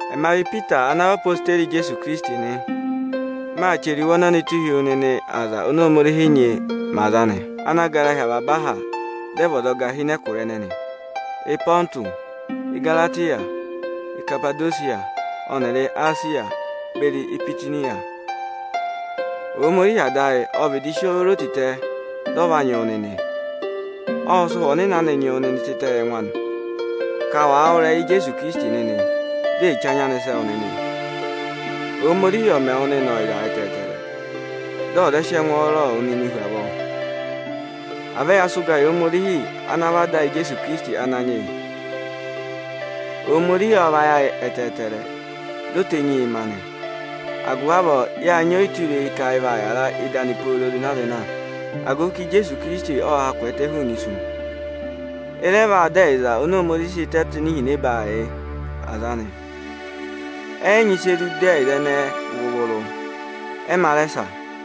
Ẹma vị Ipita ana vị odeyi Ijeesu Ikirisiti nị. Maa chẹrẹ iwe ọnọnịị tụ́ụ hi wu nịnị aza oni Ohomorihi nyị mẹ aza anị, ana gara hi avaba aha, dị ẹ vị ọzọga hi ịnị ẹkụra Ịpọntụsị, Ịgaratịya, Ikapadosiya ọnịrị Esiya beri Ibitiniya. Ohomorihi Ada ayị ô vịdị si o ro tịtẹ, dị ọ va nyị wụ nịnị nị. Ộ sị Ụhwẹ Ọnịnị anị nyị wụ nịnị tịtẹ yị ẹngụ anị, ka wa wụ́ ịrẹyị Ijeesu Ikirisiti nịnị, dị e che anya anị sẹ́ wụ nịnị. Ohomorihi ọ̀ mẹ ọyịza ọnịrị ẹngwọọrọ anị yị wụ nịnị hu avọọ hu avọọ! À vẹ ya sị ụga yị Ohomorihi ana vị Ada Ijeesu Ikirisiti Ananyị yị! Ohomorihi ộ vayị ayị ẹtẹẹtẹrẹ, di o tenyi yị ma nị. Agụvị avọọ yáa nyị ọyịtureyi ka ị vaa yara ịdị anị pooro zịna-zịna, agụvị ka Ijeesu Ikirisiti ộ ha kwẹẹtẹ hụụnị isu. Ị rẹ vaa dọ ẹyịza oni Ohomorihi sị tẹ tụ́ ịnị ihinẹba yị aza anị. Ẹ yị nyị ịsị e zụ du ẹyịza ẹnẹẹ vụrụ-vụrụ, ẹ yị ma rẹ sa.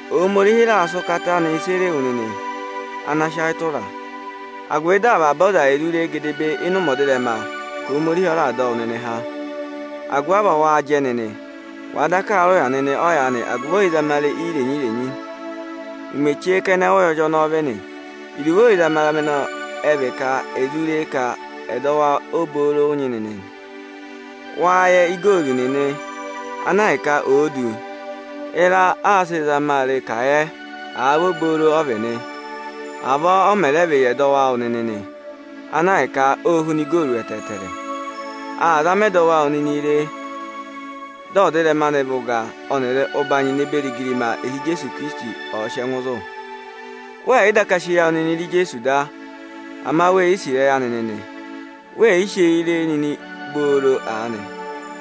Ohomorihi raà sị ụkata anị sere wu nịnị, ana sị ayị tụra a, agụvị dị avaba aza e zụ ree gedebee ịnị ụmẹ ọdịrẹma, ka Ohomorihi ọ raà dọ wụ nịnị há. Agụvị avọọ waa jẹ nịnị, wàa daka aa rị ụya nịnị ọyaanị agụvị ẹzamare irenyi-irenyi. Ụmẹ chee ụ́yọrị ọnọọ vị nị. Iruvo ẹzamare ẹnẹẹ ọ vị ka è zu ré ka ẹdọwụ obooro ụ nyị nịnị nị. Wâ yẹ igooru nịnị, ana ahịka oō du; ịra aā sịị zama a re ka à yẹ, àa vị obooro ọ vị nị. Avọọ ọ mẹ rẹ vị yị ẹdọwụ awụ nịnị nị, ana ahịka óo huna igooru ẹtẹẹtẹrẹ. Àa zama ẹdọwụ awụ nịnị re, dị ọdịrẹma anị vị ụga ọnịrị ụbanyị ne beri igirima, ịhị Ijeesu ọ̀ọ sị ẹngụ zụ̀. Wẹẹ̀ yị daka sị eyi awụ nịnị re Ijeesu Ikirisiti da, ama we yi sì ịrẹyị anị nịnị. We yi si eyi ree nịnị booro aanị,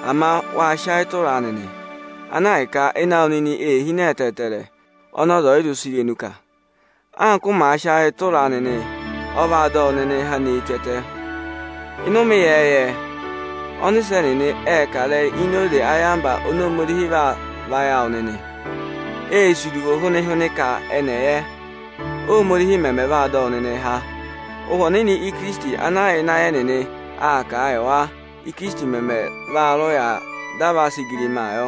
ama wáa sị ayị tụra a nịnị, ana ahịka ayị awụ nịnị ee hine ẹtẹẹtẹrẹ oni irenu ọ̀ yị zụ kà. Agụvị ka waa sị ayị tụra a nịnị, ọ vaa dọ wụ nịnịị há nee tù ẹtẹ. Ịnị ụmẹ ịyẹẹyẹ, ọnịsẹ nịnị ệ kà ịrẹyị ini oze ayamva oni Ohomorihi vaa vayị awụ nịnị. Ê sì iruvo hwịnị-hwịnị ka ẹnị ẹ̀ yẹ, Ohomorihi mẹmẹ vaa dọ wụ nịnịị há. Ụhwẹ Ọnịnị Ikirisiti ana yà ịnị ayị ẹnịnị aa kà a yị wa, Ikirisiti mẹmẹ vaa rị ụya dị à va sị igirimaa yọ.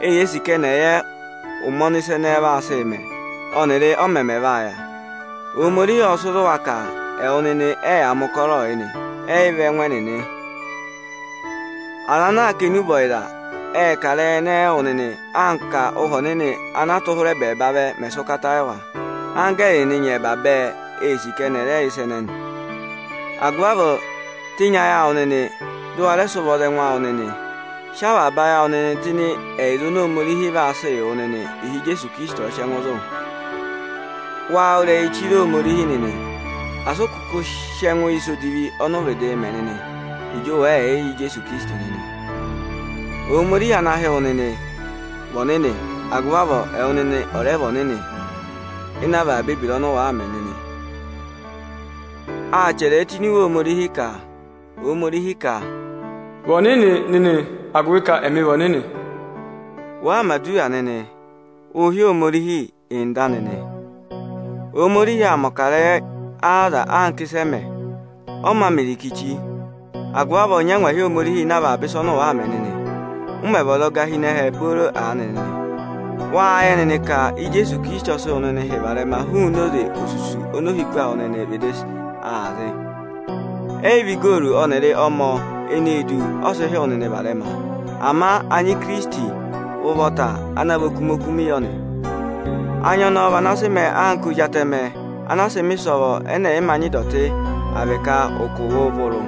Eyee sì ka ẹnị ẹ̀ yẹ ụmẹ ọnị ịsa ẹnẹnị vaa sị mẹ ọnịrị ọ mẹmẹ vaa yà. Ohomorihi ộ sị zụ wa ka ẹwụ nịnị ẹyaa mẹ ụkọrọọ yị nị, ẹ́ yị vị ẹngụ ẹnịnị. Aza anaā kà enube ọyịza ệ kà a wụ nịnị, anka Ụhwẹ Ọnịnị ana a tụ́ hụrị ẹbẹẹba vẹ mẹ̀ sị ụkata yị wa. Anggẹẹrị nịnị nyẹmba bẹẹ ee sì ka eni è re ịsa ẹnẹnị. Agụvị avọọ, tenyi ayị awụ nịnị, dị ụ wa ẹ sị ụvọ za ẹngụ awụ nịnị! Sị avaba ayị awụ tụ́ ịnị ẹyịza oni Ohomorihi vaa sị yị wụ nịnị, ịhị Ijeesu Ikirisiti ọ̀ọ sị ẹngụ zụ̀. Waa wụ́ ịrẹyị chire Ohomorihi nịnị, asị ụ kụkụ sị ẹngụ yị ịsa edivi ọnị ụ vịdịị mẹ nịnị, ịjị ụ wẹ̀ yị yẹ Ijeesu Ikirisiti nịnị. Ohomorihi ana hị́ wụ nịnị, vị ọnịnị; agụvị avọọ, ẹwụ nịnị ọ̀ rẹ vị ọnịnị ịnị avaba ebira awụ nịnị! Â chẹrẹ ẹ tụ́ ini iwe Ohomorihi ka Ohomorihi ka: Vị ọnịnị nịnị, agụvị ka ẹmị vị ọnịnị. Wàa mẹ̀ aduwa nịnị, ụụ̄ hị́ Ohomorihi: Nda, nịnị. Ohomorihi àaa mẹ̀ ọkarẹyị aza anka ịsị ẹ mẹ, ọ mā mẹ irikichi; agụvị avọọ, nyị angwahi Ohomorihi ịnị avaba ịsa ọnị ụ waa mẹ nịnị, ụ mẹ̀ vị ọzọga hi ẹhẹ nịnị booro aanị. Wâ yẹ nịnị ka Ijeesu Ikirisiti ọ sị wụ nịnị hị́ varẹma hụụnị oze osusu oni ohiku awụ nịnị vịdị aa zị. Ẹ́ yị vị igooru ọnịrị ọmọ eneē du, ọ sị hị́ wụ nịnị varẹma, ama anya Ikirisiti ụvọta ana vị ịsa ọkụmị-ọkụmị yọ nị. Anya ọnọọ vị ana sị mẹẹ anka anya ozi atẹmẹ ana a sịị̄ mẹ̀ ịsọvọ ẹnẹ ẹ̀ yị mā nyị ịdọtị, àa vị ụkụ vụrụ-vụrụ.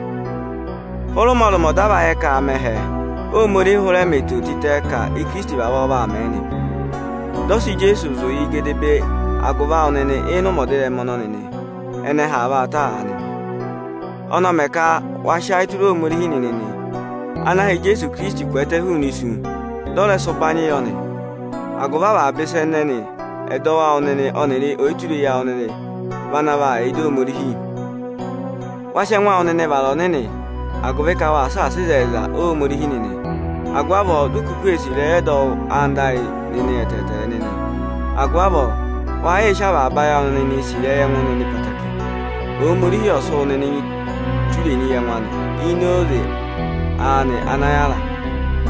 Hụrị ụmọrụmọ dị a va yẹ ka aa mẹ ẹhẹ, Ohomorihi hụrẹ mẹ eto tịtẹ ka Ikirisiti vavọọ vaa mẹ nị. Dị ọ sị Ijeesu zụ̀ gedebee agụvị awụ nịnị ịnị ụmẹ ọdịrẹma ọnọnị, ẹnẹ ẹhẹ aa vaa ta aanị nị. Ọnị ọ mẹ ka wa sị ayị tụra Ohomorihi nịnị nị, ana ha Ijeesu Ikirisiti kwẹẹtẹ hụụnị isu, dị ọ rẹ sị ụbanyị yọ nị. Agụvị avaba ịsa ẹnẹnị ẹ́dọwụ awụ nịnị ọnịrị ọyịtureyi awụ nịnị vị ana yà ịdị Ohomorihi. Wa sị ẹngụ awụ nịnị vara aza ọnịnị, agụvị ka waa saasa ịzẹyịza Ohomorihi nịnị; agụvị avọọ di u kuku ee sì ịrẹyị ọdọwụ anda ayị nịnị ẹtẹẹtẹrẹ nị. Agụvị avọọ, wa yịị sị avaba ayị awụ nịnịị sì ịrẹyị ẹngụ nịnị ẹtẹẹtẹrẹ. Ohomorihi ọ sị wụ nịnị tenyi ma ini oze ịrẹyị anị ana yára,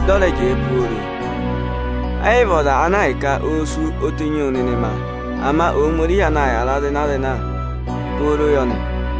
dị ọ rẹ jẹẹ pooro. Ẹ́ yị vị ọza ana ahịka oō sú, o tenyi wụ nịnị ma, ama Ohomorihi ana yára zịna-zịna pooro yọ nị.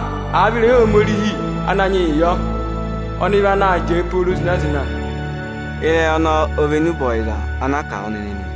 Ama ịrẹyị Ohomorihi Ananyị vị ana yịị yọ pooro zịna-zịna. Ịrẹyị ọnọnị ọ vị enube ọyịza ana aa kà a wụ nịnị nị.